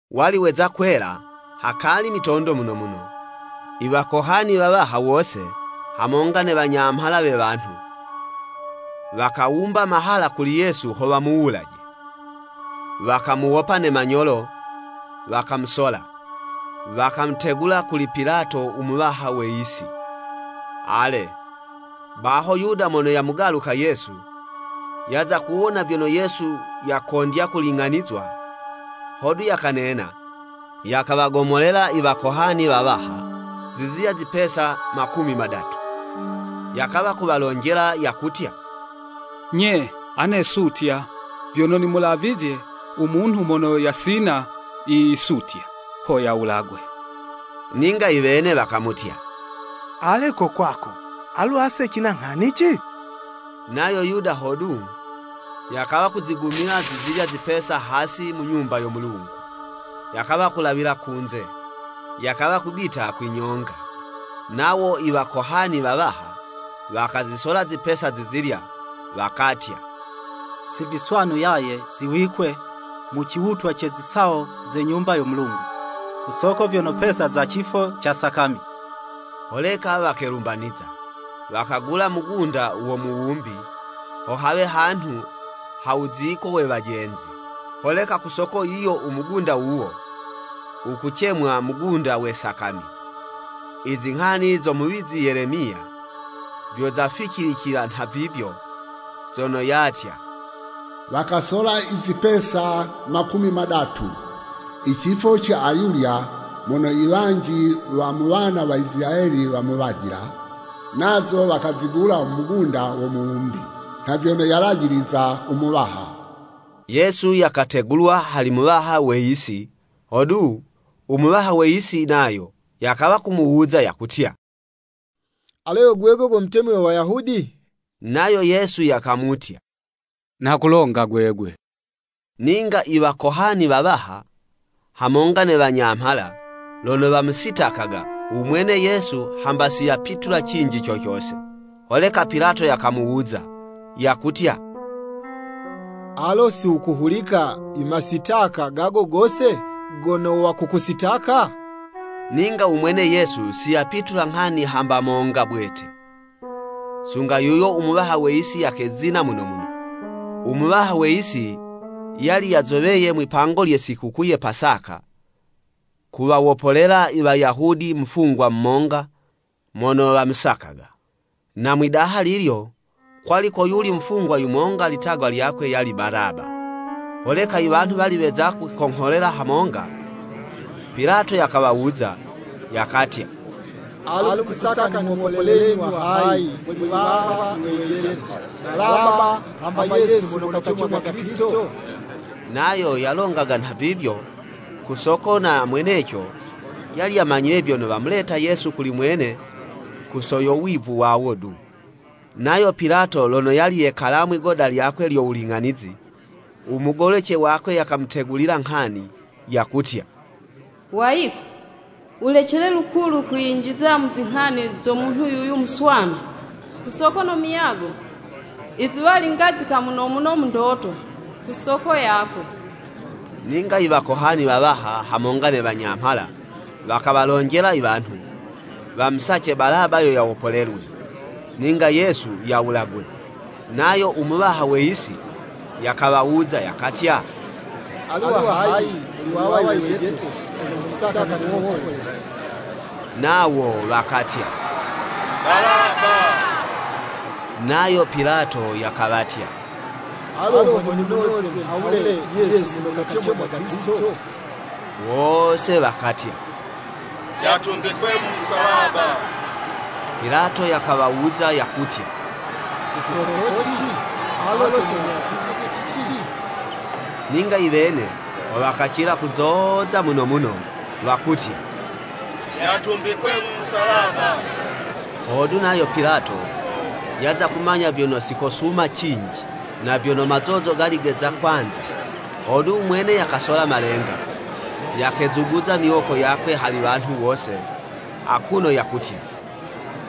Wali weza kwela, hakali mitondo muno muno, i wakohani wawaha wose, hamonga ne wanyamhala we wanhu, wakawumba mahala kuli Yesu ho wamuwulaje. Wakamuwopa ne manyolo wakamusola, wakamutegula kuli Pilato u muwaha we yisi. Ale, baho Yuda mono yamugaluka Yesu, yaza kuwona vyono Yesu yakondya kuling'anizwa, hodu, yakanena, yakawagomolela i Wakohani wawaha, zizilya zipesa makumi madatu. Yakawa kuwalonjela yakutya, “Nye, ane sutya, vyono nimulavizye u munhu mono yasina yisutya, ho yawulagwe.” Ninga iwene wakamutya, “Ale ko kwako, alu ase cina nghanici?” Nayo Yuda hodu, yakawa kuzigumila zizilya zipesa hasi mu Nyumba yo Mulungu, yakawa kulawila kunze, yakawa kubita kwinyonga. Nawo i wakohani wawaha, wakazisola zipesa zizilya, wakatya, “Si viswanu yaye ziwikwe mu ciwutwa ce zisawo ze Nyumba yo Mulungu, ku soko vyono pesa za cifo ca Sakami.” Holeka wakelumbaniza, wakagula mugunda wo muwumbi, ho hawe hanhu ha wuziko we wajenzi. Holeka ku soko yiyo u mugunda wuwo, wukucemwa, mugunda we sakami. Izinghani zo muwizi Yelemiya, vyo zaficilicila nhavivyo, zono yatya, “Wakasola i zipesa makumi madatu, i cifo ca ayulya mono i wanji wa mu wana wa Isilayeli wamuwajila. Nazo wakazigula mugunda wo muwumbi, nha vyono yalajiliza u Muwaha.” Yesu yakategulwa hali muwaha we yisi. Hodu, u muwaha we yisi nayo, yakawa kumuwuza yakutya, “Alo yo gwegwe go Mutemi we Wayahudi?” Nayo Yesu yakamutya, “Nha kulonga gwegwe.” Ninga i wakohani wawaha, hamonga ne wanyamhala, lono wamusitakaga, u mwene Yesu, hamba si yapitula cinji co cose. Holeka Pilato yakamuwuza, yakutya, “Alo ho si wukuhulika i masitaka gago gose, gono wakukusitaka?” Ninga u mwene Yesu si yapitula nghani hamba monga bwete, sunga yuyo u muwaha we yisi yakezina muno muno. U muwaha we yisi yali yazoweye mwipango lye sikukuu ye Pasaka, kuwawopolela i Wayahudi mufungwa monga mono wamusakaga. Na mwidaha lilyo, kwali koyuli mufungwa yumonga litagwa lyakwe yali Balaba. Holeka iwanhu wali weza kwikongholela hamonga, Pilato yakawawuza, yakatya, “Alu mukusaka nimuwopolelenyi wa hayi, muli wawa iwejete, Balaba, hamba Yesu mono kacemwaga Kilisito?” Nayo yalongaga nhavivyo ku soko na mweneco yali yamanyile vyono wamuleta Yesu kuli mwene ku soko yo wivu wawo du. Nayo Pilato lono yali yekala mwigoda lyakwe lyo wuling'anizi u mugolece wakwe yakamutegulila nghani, yakutya, “Wayiko, wulecele lukulu kwiyinjiza mu zinghani zo munhu yuyu muswanu, ku soko no muyago, izuwali ngazika muno muno mu ndoto, ku soko yakwe.” Ninga i wakohani wawaha hamonga ne wanyamhala, wakawalonjela iwanhu, wamusace Balaba yo yawopolelwe, ninga Yesu yawulagwe. Nayo u muwaha we yisi, yakawawuza yakatya, “Alu wa hayi, muli wawa i wejete, mono mukusaka nimuwopolele?” Nawo wakatya “Balaba.” Nayo Pilato yakawatya, “Alu ho nimunoze nhawule Yesu mono kacemwaga Kilisito?” Wose wakatya, “Yatumbikwe mu musalaba!” Pilato yakawawuza yakutya, “Ku sokoci?” Alo cono yasutizye ci cici? Ninga iwene ho wakacila kuzoza muno muno, wakutya, “Yatumbikwe mu Musalaba!” Hodu nayo Pilato yaza kumanya vyono si kosuma cinji, na vyono mazozo gali geza kwanza, hodu u mwene yakasola malenga, yakezuguza miwoko yakwe hali wanhu wose akuno yakutya,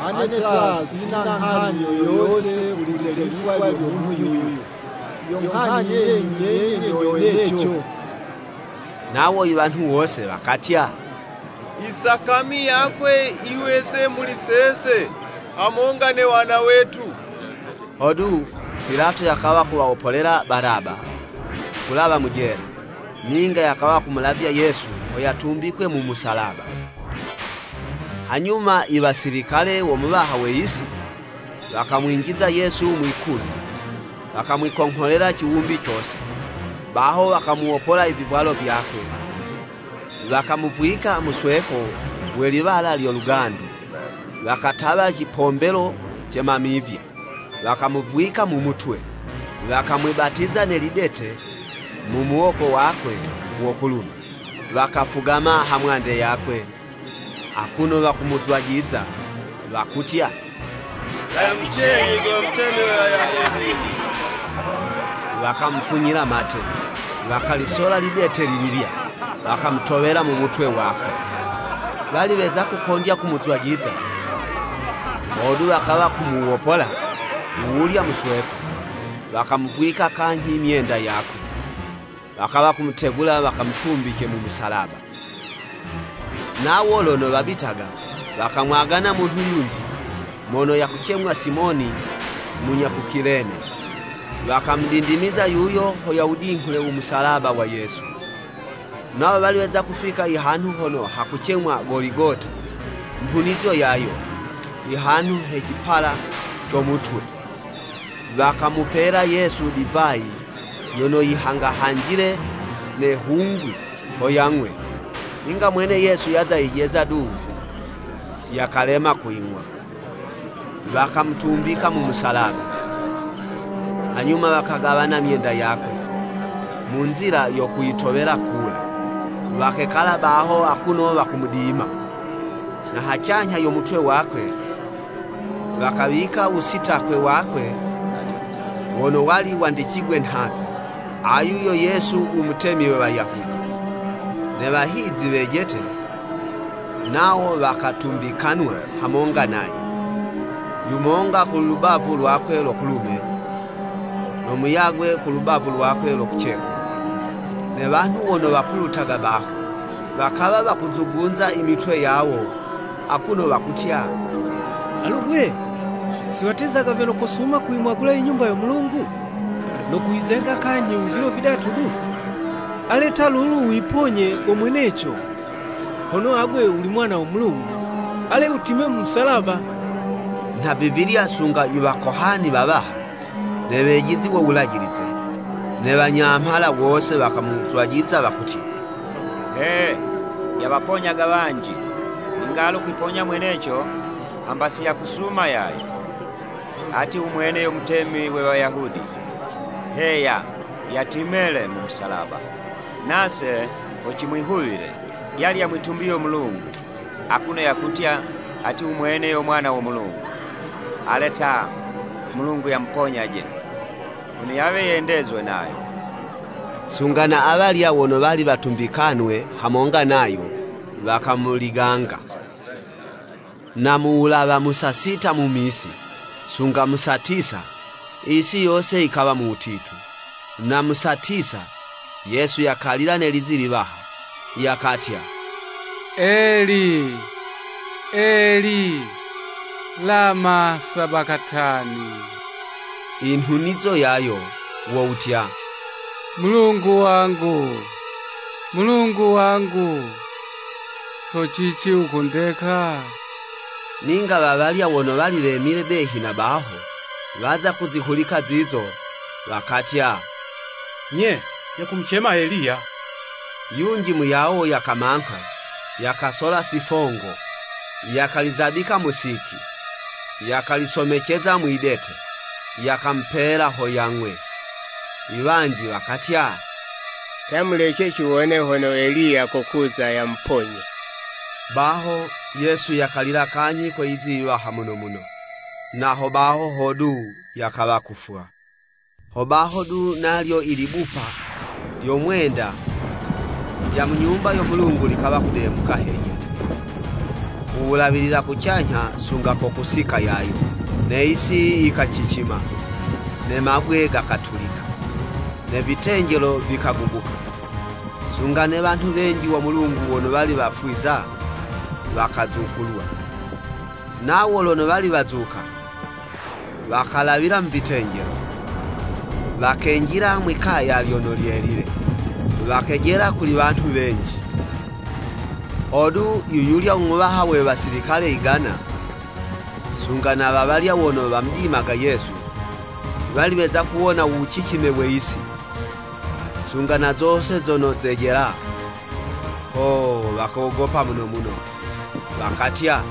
“Ane ta, sina nghani yo yose kuli ze lifwa lyo munhu yuyu, yo nghani yenyu nyenye nyo weneco.” Nawo iwanhu wose wakatya, “Isakami yakwe yiweze muli sese, hamonga ne wana wetu!” Hodu, Pilato yakawa kuwawopolela Balaba, kulawa mu jela, ninga yakawa kumulavya Yesu ho yatumbikwe mu musalaba. Hanyuma iwasilikale wo muwaha we yisi, wakamwinjiza Yesu mwi'kulu, wakamwikongholela ciwumbi cose. Baho wakamuwopola i vivwalo vyakwe, wakamuvwika musweko we liwala lyo lugandu, wakatawa cipombelo ce mamivya, wakamuvwika mu mutwe, wakamwibatiza ne lidete mu muwoko wakwe wo kulume. Wakafugama ha mwande yakwe, akuno wakumuzwajiza wakutya, “Lamucenyi go Mutemi we Wayahudi!” Wakamufunyila mate, wakalisola lidete lililya, wakamutowela mu mutwe wakwe. Wali weza kukondya kumuzwajiza, hodu wakawa kumuwopola wuwulya musweko, wakamuvwika kanyhi myenda yakwe, wakawa kumutegula wakamutumbice mu musalaba. Nawo lono wabitaga wakamwagana munhu yunji mono yakucemwa Simoni munya ku Kilene, wakamudindimiza yuyo ho yawudinghule u musalaba wa Yesu. Nawo wali weza kufika i hanhu hono hakucemwa Goligota, nhunizo yayo, “Ihanhu he cipala co mutwe.” Wakamupela Yesu divayi yono yihangahanjile ne hungwi ho yang'we. Ninga mwene Yesu yaza yijeza du, yakalema kuying'wa. Wakamutumbika mu musalaba, hanyuma wakagawana myenda yakwe, mu nzila yo kuyitowela kula. Wakekala baho akuno wakumudima. Na hacanyha yo mutwe wakwe, wakawika u wusitakwe wakwe wono wali wandicigwe nhavi, “Ayu yo Yesu u Mutemi we Wayahudi.” Ne wahizi wejete, nawo wakatumbikanwa hamonga nayo, yumonga ku lubavu lwakwe lo kulume, no muyagwe kulubavu lwakwe lo kucekulu. Ne wanhu wono wapulutaga baho, wakawa wakuzugunza i mitwe yawo, akuno wakutya, “Alu 'gwe! Si watezaga vyono kosuma kuyimwagula i Nyumba yo Mulungu, no kuyizenga kanyhi mu vilo vidatu du? Ale ta, luno wiponyaje go mweneco. Hono agwe wuli Mwana wo Mulungu, ale wutime mu musalaba!” Nha vivilya sunga i Wakohani wawaha, ne wejizi wo Wulajilize, ne wanyamhala, wose wakamuzwajiza wakutya. “He! Yawaponyaga wanji ninga alu kuwiponya mweneco, hamba si yakusuma yaye! Ati u mwene yo mutemi we Wayahudi! Heya, yatime le, mu musalaba, nase ho cimwihuwile. Yali yamwitumbiye u Mulungu, akuno yakutya, ati u mwene yo Mwana wo Mulungu, ale ta, u Mulungu yamuponyaje, hono yawe yendezwe nayo.” Sunga na awalya wono wali watumbikanwe hamonga nayo, wakamuliganga. Na mu wulawa mu saa sita mu misi, sunga mu saa tisa, yisi yose yikawa mu wutitu. Na mu saa tisa, Yesu yakalila ne lizi yiwaha, yakatya, “Eli, Eli, lamasabakatani?” Inhunizo yayo, wo wutya, “Mulungu wangu, Mulungu wangu, so cici wukundeka?” Ninga wawalya wono wali wemile behi na baho, waza kuzihulika zizo, wakatya, “Nye, yakumucema Eliya.” Yunji muyawo yakamangha, yakasola sifongo, yakalizabika mu siki, yakalisomeceza mwidete, yakamupela ho yang'we. Iwanji wakatya, “Ta mulece ciwone hono Eliya kokuza yamuponye.” Baho, Yesu yakalila kanyhi kwe lizi yiwaha muno muno, na hobaho hodu yakawa kufwa. Hobaho du nalyo i libupa lyo mwenda lya mu Nyumba yo Mulungu likawa kudemuka hejete, kuwulawilila kucanyha sunga ko kusika yayo, ne yisi yikacicima, ne mabwe gakatulika, ne vitenjelo vikagubuka, sunga ne wanhu wenji wo Mulungu wono wali wafwiza, wakazukulwa, nawo lono wali wazuka, wakalawila mu vitenjelo, wakenjila mwi'kaya lyono lyelile, wakejela kuli wanhu wenji. Hodu, yuyulya u muwaha we wasilikale igana, sunga na wawalya wono wamudimaga Yesu, wali weza kuwona u wucicime we yisi, sunga na zose zono zejela, Oo! Wakogopa muno muno, wakatya,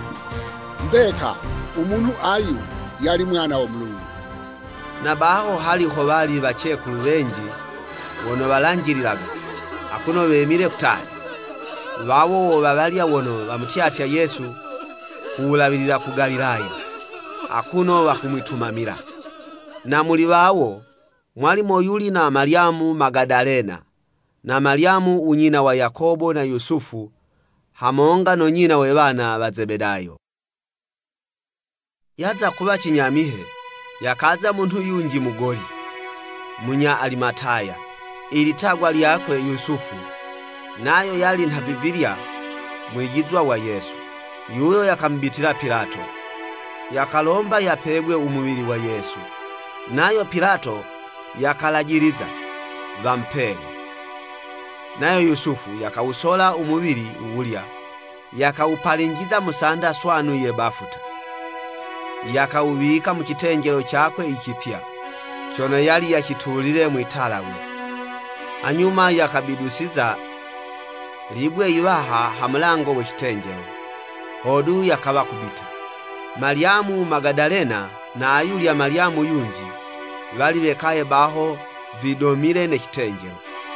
“Mbeka u munhu ayu, yali Mwana wo Mulungu.” Na baho hali howali wacekulu wenji wono walanjililaga, akuno wemile kutali. Wawo wo wawalya wono wamutyatya Yesu ku wulawilila ku Galilaya, akuno wakumwitumamila. Na muli wawo, mwali moyuli na Malyamu Magadalena, na Malyamu u nyina wa Yakobo na Yusufu hamonga no nyina we wana wa Zebedayo. Yaza kuwa cinyamihe, yakaza munhu yunji mugoli, munya Alimataya, ilitagwa lyakwe, Yusufu. Nayo yali nhavivilya mwijizwa wa Yesu. Yuyo, yakamubitila Pilato, yakalomba yapegwe u muwili wa Yesu. Nayo Pilato yakalajiliza, wamupele. Nayo Yusufu, yakawusola u muwili wuwulya, yakawupalinjiza mu sanda swanu ye bafuta, yakawuwika mu citenjelo cakwe i cipya, cono yali yacitulile mwi'talawe. Hanyuma, yakabidusiza libwe yiwaha, ha mulango we citenjelo, hodu yakawa kubita. Malyamu Magadalena na ayulya Malyamu yunji, wali wekaye baho vidomile ne citenjelo.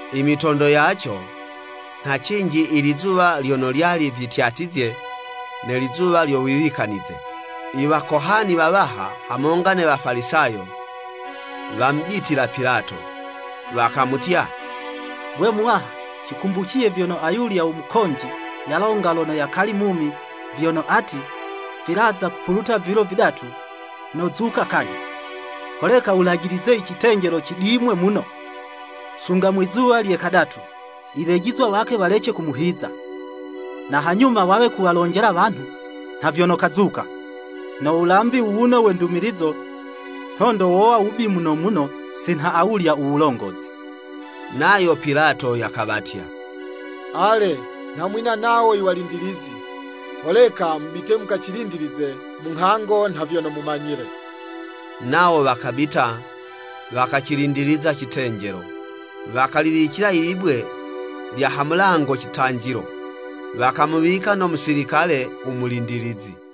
Imitondo yaco, nha cinji ilizuwa lyono lyali vityatyizye ne lizuwa lyo Wiwikanize, i wakohani wawaha, hamonga ne Wafalisayo, wamubitila Pilato, wakamutya, “Gwe muwaha, cikumbuciye vyono ayulya u mukonji yalonga lono yakali mumi vyono ati, ‘Vilaza kupuluta vilo vidatu, nozuka kanyhi.’ Holeka wulajilize i citenjelo cidimwe muno, sunga mwizuwa lye kadatu, iwejizwa wakwe walece kumuhiza, na hanyuma wawe kuwalonjela wanhu, nha vyono kazuka. No wulambi wuwuno we ndumilizo, nhondo wowa wubi muno muno si nha awulya u wulongozi.” Nayo Pilato yakawatya, “Ale, nha mwina nawo i walindilizi, holeka mubite mukacilindilize, munghango nha vyono mumanyile.” Nawo wakabita, wakacilindiliza citenjelo, wakaliwicila ilibwe lya ha mulango citanjilo, wakamuwika no musilikale u mulindilizi.